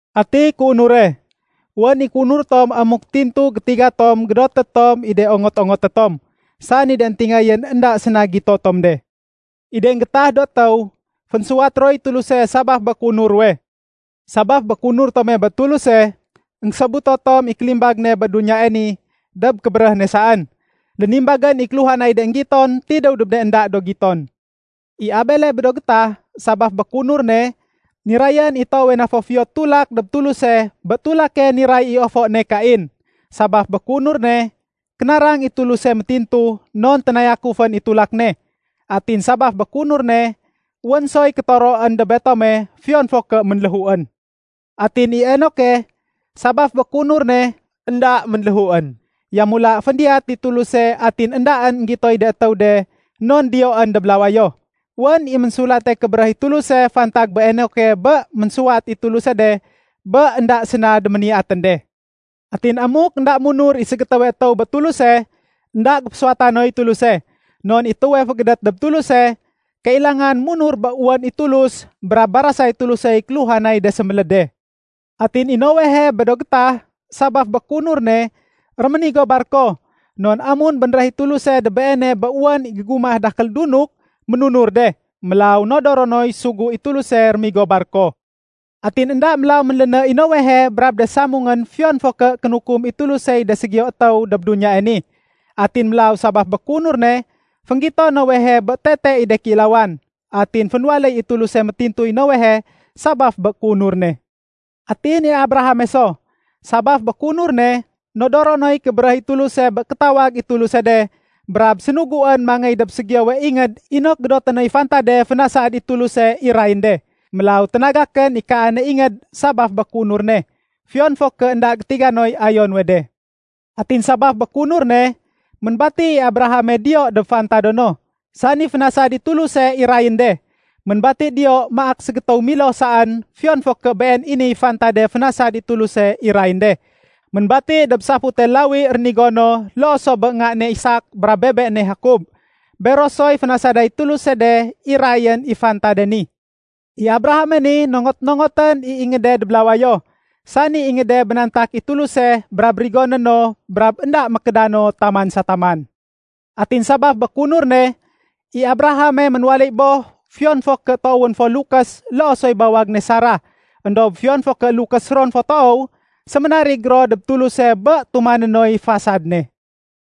Ati kéunure? Wén i kéunur tom amuk tintu gétiga tom gédoté tom i de ongot-ongoté tom, sani de éntingayén énda séna gito tom de. I de énggéétah do étéw, fénsuwat roy Tuluse sabaf bé kéunur ruwe. Sabaf bé kéunur tome bé Tuluse, énggésobuto tom i kélimbag ne bé duniyae ni dob kébéréh ne saén. Lénimbagén i kéluhanay de énggiton tidéw dob de énda do giton. I Abele bé do gétah, sabaf bé kéunur ne, nirayén i toowe na fo fiyo tulak dob Tuluse bé tulake niray i ofo ne Kain. Sabaf bé kéunur ne, kénarang i Tuluse métintu, non ténayakufén i tulak ne. Atin sabaf bé kéunur ne, wén soy kétoroén dob betome fiyon fo ké ménléhuén. Atin i Enoke, sabaf bé kéunur ne, énda ménléhuén. Yamula féndiyat i Tuluse atin éndaén énggitoy de étéw de non diyoén dob lawayo. Wén i Ménsulate Kébéréh i Tuluse fantag bé Enoke bé ménsuwat i Tuluse de bé énda séna déméniyatén de. Atin amuk énda munur i ségétéwe étéw bé Tuluse, énda géfésuwata noy Tuluse. Non i étéwe fégédét dob Tuluse, kailangan munur bé wén i Tulus brab barasay Tulusey kéluhanay de séméléd de. Atin i Noehe bé do gétah sabaf bé kéunur ne, réménigo barko. Non amun bénréh i Tuluse dob beene bé wén i gégumah dakél dunuk, ménunur de. Mélaw nodoro noy sugu i Tuluse rémigo barko. Atin énda mélaw ménléné i Noehe brab de samungén fiyon fo ké kénukum i Tulusey de ségiyo étéw dob duniyae ni. Atin mélaw sabaf bé kéunur ne, fénggito Noehe bé tete i de kéilawan. Atin fénwaléy i Tuluse métintuy Noehe sabaf bé kéunur ne. Atin i Abrahame so, sabaf bé kéunur ne, nodoro noy kébéréh i Tuluse bé kétawag i Tuluse de brab sénuguén mangéy dob ségiyowe ingéd inok gédoté noy fantade fénasad i Tuluse irayén de. Mélaw ténagakén i kaane ingéd sabaf bé kéunur ne, fiyon fo ké énda gétiga noy ayo nuwe de. Atin sabaf bé kéunur ne, ménbati i Abrahame diyo dob fantado no, sani fénasad i Tuluse irayén de. Ménbati diyo maak ségétéw miloh saén fiyon fo ké been i niy fantade fénasad i Tuluse irayén de. Ménbati dob safute lawi rénigo no loo so bé nga ne Isak brab bebe né Jakob. Bero soy fénasaday Tuluse de irayén i fantade ni. I Abrahame ni, nongot-nongotén i ingéde dob lawayo, sani ingéde bénantak i Tuluse brab rigoné no brab énda mékédano taman sa taman. Atin sabaf bé kéunur ne, i Abrahame ménwaléy boh, fiyon fo ké toowén fo lukés loo soy bawag ne Sarah. Endob fiyon fo ké lukés ron fo toow, séménarig ro dob Tuluse bé tumané noy fasad ne.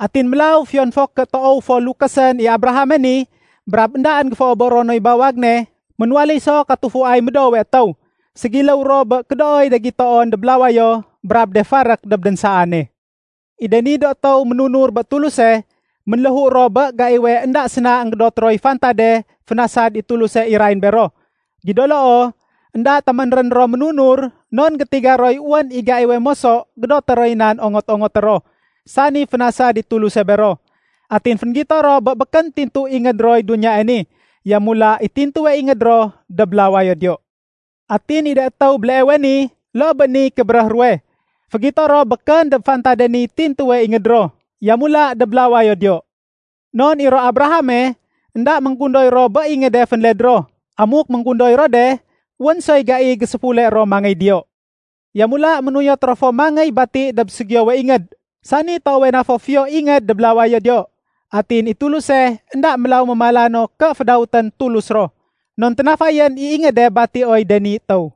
Atin mélaw fiyon fo ké toow fo lukésén i Abrahame ni brab éndaén géféoboro noy bawag ne, ménwaléy so katufuay médoowe étéw. Ségiléw ro bé kédooy de gitoon dob lawayo brab de farék dob dénsaane. I de ni do étéw ménunur bé Tuluse, ménléhu ro bé gaiwe énda séna énggédot roy fantade fénasad i Tuluse irayén bero. Gido loo, énda téménrén ro ménunur, non gétiga roy wén i gaiwe moso gédoté roy nan ongot-ongoté ro, sani fénasad i Tuluse bero. Atin fénggito ro bé békén tintu ingéd roy duniyae ni, yamula i tintuwe ingéd ro dob lawayo diyo. Atin i de étéw béleewe ni loo bé niy kébéréh ruwe, fégito ro békén dob fantade niy tintuwe ingéd ro, yamula dob lawayo diyo. Non i ro Abrahame, énda ménggundoy ro bé ingéde fénled ro. Amuk ménggundoy ro de, wén soy gai géséfule ro mangéy diyo. Yamula, ménuyot ro fo mangéy bati dob ségiyowe ingéd, sani toowe na fo fiyo ingéd dob lawayo diyo. Atin i Tuluse énda mélaw mémala no ké fédawétén Tulus ro. Non ténafayén i ingéde batioy de ni étéw.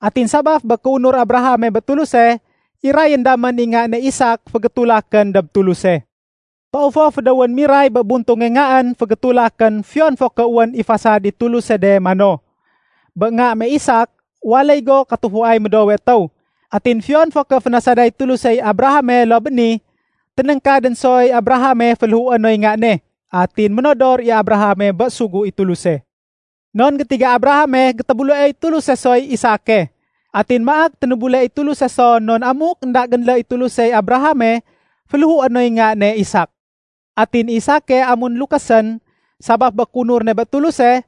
Atin sabaf bé kéunur Abrahame bé Tuluse, irayén damén i nga ne Isak fégétulakén dob Tuluse. Toow fo fédéwén miray bé buntunge ngaén fégétulakén fiyon fo ké wén i fasad i Tuluse de mano, “Bé nga me Isak, waléy go katufuay médoowe étéw.” Atin fiyon fo ké fénasaday Tulusey Abrahame loo bé ni, ténéngkadén soy Abrahame féléhué noy nga ne. Atin ménodor i Abrahame bé sugu i Tuluse. Non gétiga Abrahame gétébuleoy Tuluse soy Isake. Atin maak ténébule i Tuluse so non amuk énda génlé i Tulusey Abrahame, féléhué noy nga ne Isak. Atin i Isake amun lukésén, sabaf bé kéunur ne bé Tuluse,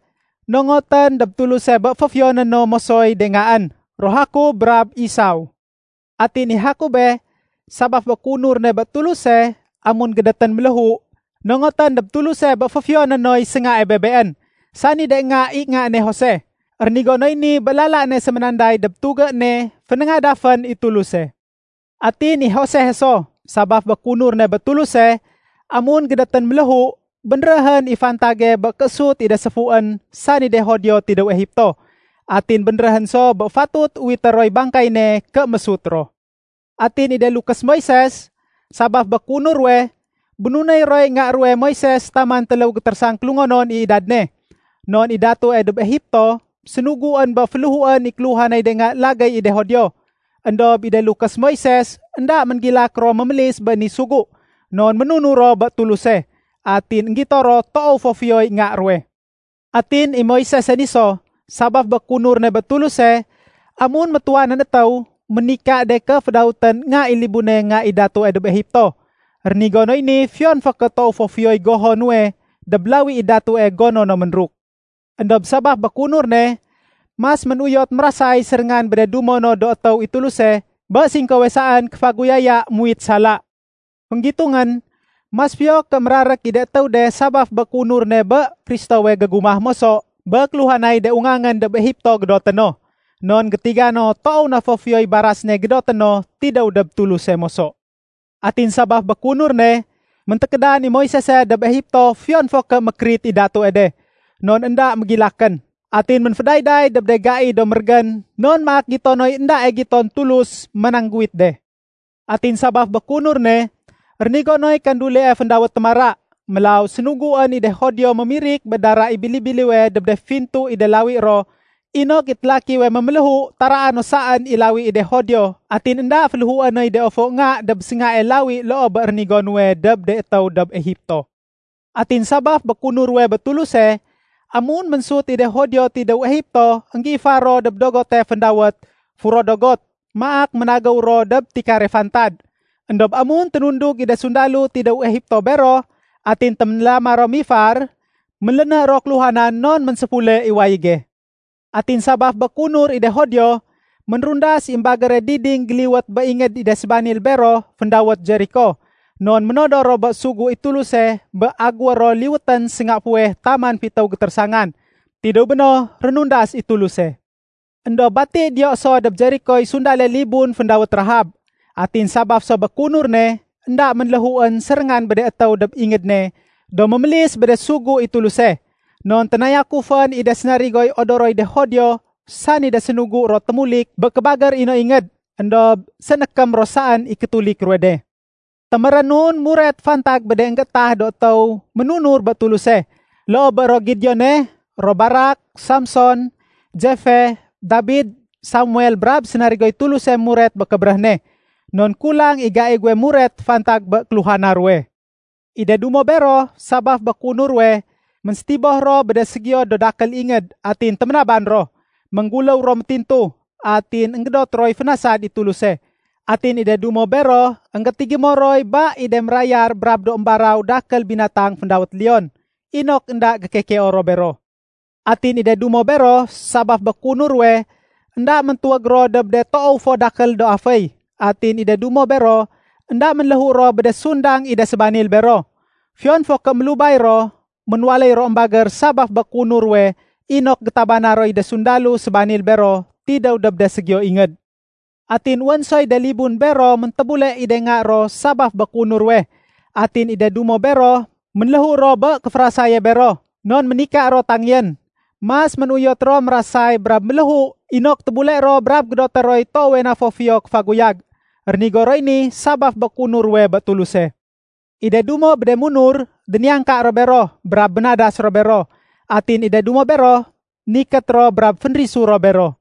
nongotén dob Tuluse bé féfiyoné no mosoy de ngaén, ro Jakob brab Isaw. Atin i Jakobe, sabaf bé kéunur ne bé Tuluse, amun gédétén méléhu, nongotén dob Tuluse bé féfiyoné noy séngae bebeén, sani de nga i nga ne Jose. Rénigo noy ni bé lala ne séménanday dob tugé ne fénéngadafén i Tuluse. Atin i Josehe so, sabaf bé kéunur ne bé Tuluse, amun gédétén méléhu, bénréhén i fantage bé kéésut i de séfuén, sani de Judio, tidéw Egipto. Atin bénréhén so bé fatut uwité roy bangkay ne ké mésut ro. Atin i de lukés Moises, sabaf bé kéunur ruwe, bénunéy roy nga ruwe Moises taman téléw gétérésang kélungonon i idad ne. Non i datue dob Egipto, sénuguén bé féléhuén i kéluhanay de nga lagéy i de Judio. Endob i de lukés Moisese énda ménggilak ro mémélis bé ni sugu, non ménunur ro bé Tuluse. Atin énggito ro toow fo fiyoy nga ruwe. Atin i Moisese ni so, sabaf bé kéunur ne bé Tuluse, amun métuwanén étéw, ménika de ké fédawétén nga i libune nga i Datue dob Egipto. Rénigo noy ni fiyon fo ké toow fo fiyoy goho nuwe dob lawi i datue gono no ménruk. Endob sabaf bé kéunur ne, mas ménuyot mérasay séréngan bé de dumo no do étéw i Tuluse bé singkowe saén kéféguyaya muwit sala. Fénggitungén, mas fiyo ké mérarék i de étéw de sabaf bé kéunur ne bé Kristowe gégumah moso bé kéluhanay de ungangén dob Egipto gédoté no. Non gétiga no toow na fo fiyoy baras ne gédoté no tidéw dob Tuluse moso. Atin sabaf bé kéunur ne, méntékédan i Moisese dob Egipto fiyon fo ké mékérit i Datue de, non énda mégilakén. Atin ménfédayday dob de gai do mérégén non maak gito noy éndae giton Tulus manangguwit de. Atin sabaf bé kéunur ne, rénigo noy kandulie féndawét “Témara”. Mélaw sénuguén i de Judio mémirik bé dara i bili-biliwe dob de fintu i de lawi ro inok i télakiwe méméléhu taraa no saén i lawi i de Judio atin énda féléhué noy de ofo nga dob séngae lawi loo bé rénigo nuwe dob de étéw dob Egipto. Atin sabaf bé kéunur ruwe bé Tuluse, amun ménsut i de Judio tidéw Egipto énggéifar ro dob dogote féndawét “Furo Dogot” maak ménagéw ro dob tikare fantad. Endob amun ténundug i de sundalo tidéw Egipto bero atin téménlama ro mifar, ménléné ro kéluhanan non ménséfule i wayége. Atin sabaf bé kéunur i de Judio, ménrundas i émbagére diding géliwét bé ingéd i de sébanil bero féndawét Jeriko. Non ménodor ro bé sugu i Tuluse bé agéwé ro liwétén sénga fuweh taman fitéw gétérésangan. Tidéw béno, rénundas i Tuluse. Endob bati diyo so dob Jerikoy sundale libun féndawét Rahab. Atin sabaf so bé kéunur ne, énda ménléhuén séréngan bé de étéw dob ingéd ne do mémélis bé de sugu i Tuluse. Non ténayakufén i de sénarigoy odoroy de Judio, sani de sénugu ro témulik bé kébagér i no ingéd. Endob sénékém ro saén i kétulik ruwe de. Témérénun muret fantag bé de énggéétah do étéw ménunur bé Tuluse, loo bé ro Gideone, ro Barak, Samson, Jeffe, Dabid, Samuel brab sénarigoy Tuluse muret bé kébéréh ne. Non kulang i gai guwe muret fantag bé kéluhana ruwe. I de dumo bero, sabaf bé kéunur ruwe, ménsétiboh ro bé de ségiyo do dakél ingéd atin téménaban ro. Méngguléw ro métintu, atin énggédot roy fénasad i Tuluse. Atin i de dumo bero énggétigémo roy ba i de mérayar brab do émbaraw dakél binatang féndawét leon inok énda gékekeo ro bero. Atin i de dumo bero sabaf bé kéunur ruwe, énda méntuwég ro dob de toow fo dakél do aféy. Atin i de dumo bero énda ménléhu ro bé de sundang i de sébanil bero. Fiyon fo ké mélubay ro, ménwaléy ro émbagér sabaf bé kéunur ruwe inok gétabana roy de sundalo sébanil bero tidéw dob de ségiyo ingéd. Atin wén soy de libun bero méntébule i de nga ro sabaf bé kéunur ruwe. Atin i de dumo bero, ménléhu ro bé kéférasaye bero, non ménika ro tangéyén. Mas ménuyot ro mérasay brab méléhu inok tébule ro brab gédoté roy toowe na fo fiyo kéfaguyag. Rénigo roy ni sabaf bé kéunur ruwe bé Tuluse. I de dumo bé de munur, déniyangka ro bero brab bénadas ro bero. Atin i de dumo bero, nikét ro brab fénrisu ro bero.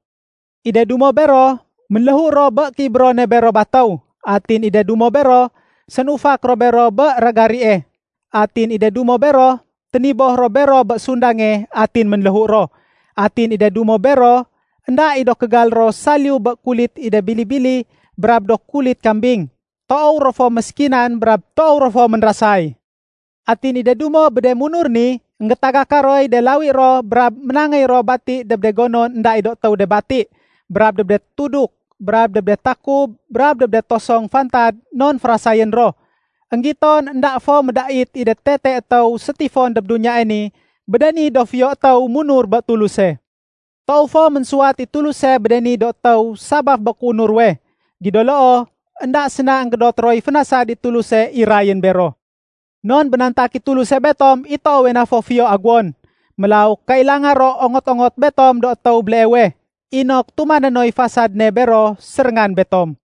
I de dumo bero, ménléhu ro bé kéibérone bero batéw. Atin i de dumo bero, sénufak ro bero bé ragarie. Atin i de dumo bero, téniboh ro bero bé sundange atin ménléhu ro. Atin i de dumo bero, énda i do kégal ro saliyu bé kulit i de bili-bili brab do kulit kambing. Toow ro fo méskinan brab toow ro fo ménrasay. Atin i de dumo bé de munur ni, énggétagaka roy de lawi ro brab ménangéy ro bati dob de gonon énda i do étéw de bati brab dob de tuduk, brab dob de takub brab dob de tosong fantad non férasayén ro. Enggiton énda fo médait i de tete étéw sétifon dob duniyae ni bé de ni do fiyo étéw munur bé Tuluse. Toow fo ménsuwat i Tuluse bé de ni do étéw sabaf bé kéunur ruwe. Gido loo, énda séna énggédot roy fénasad i Tuluse irayén bero. Non bénantak i Tuluse betom i toowe na fo fiyo aguwon. Mélaw kailanga ro ongot-ongot betom do étéw béleewe, inok tumané noy fasad ne bero séréngan betom.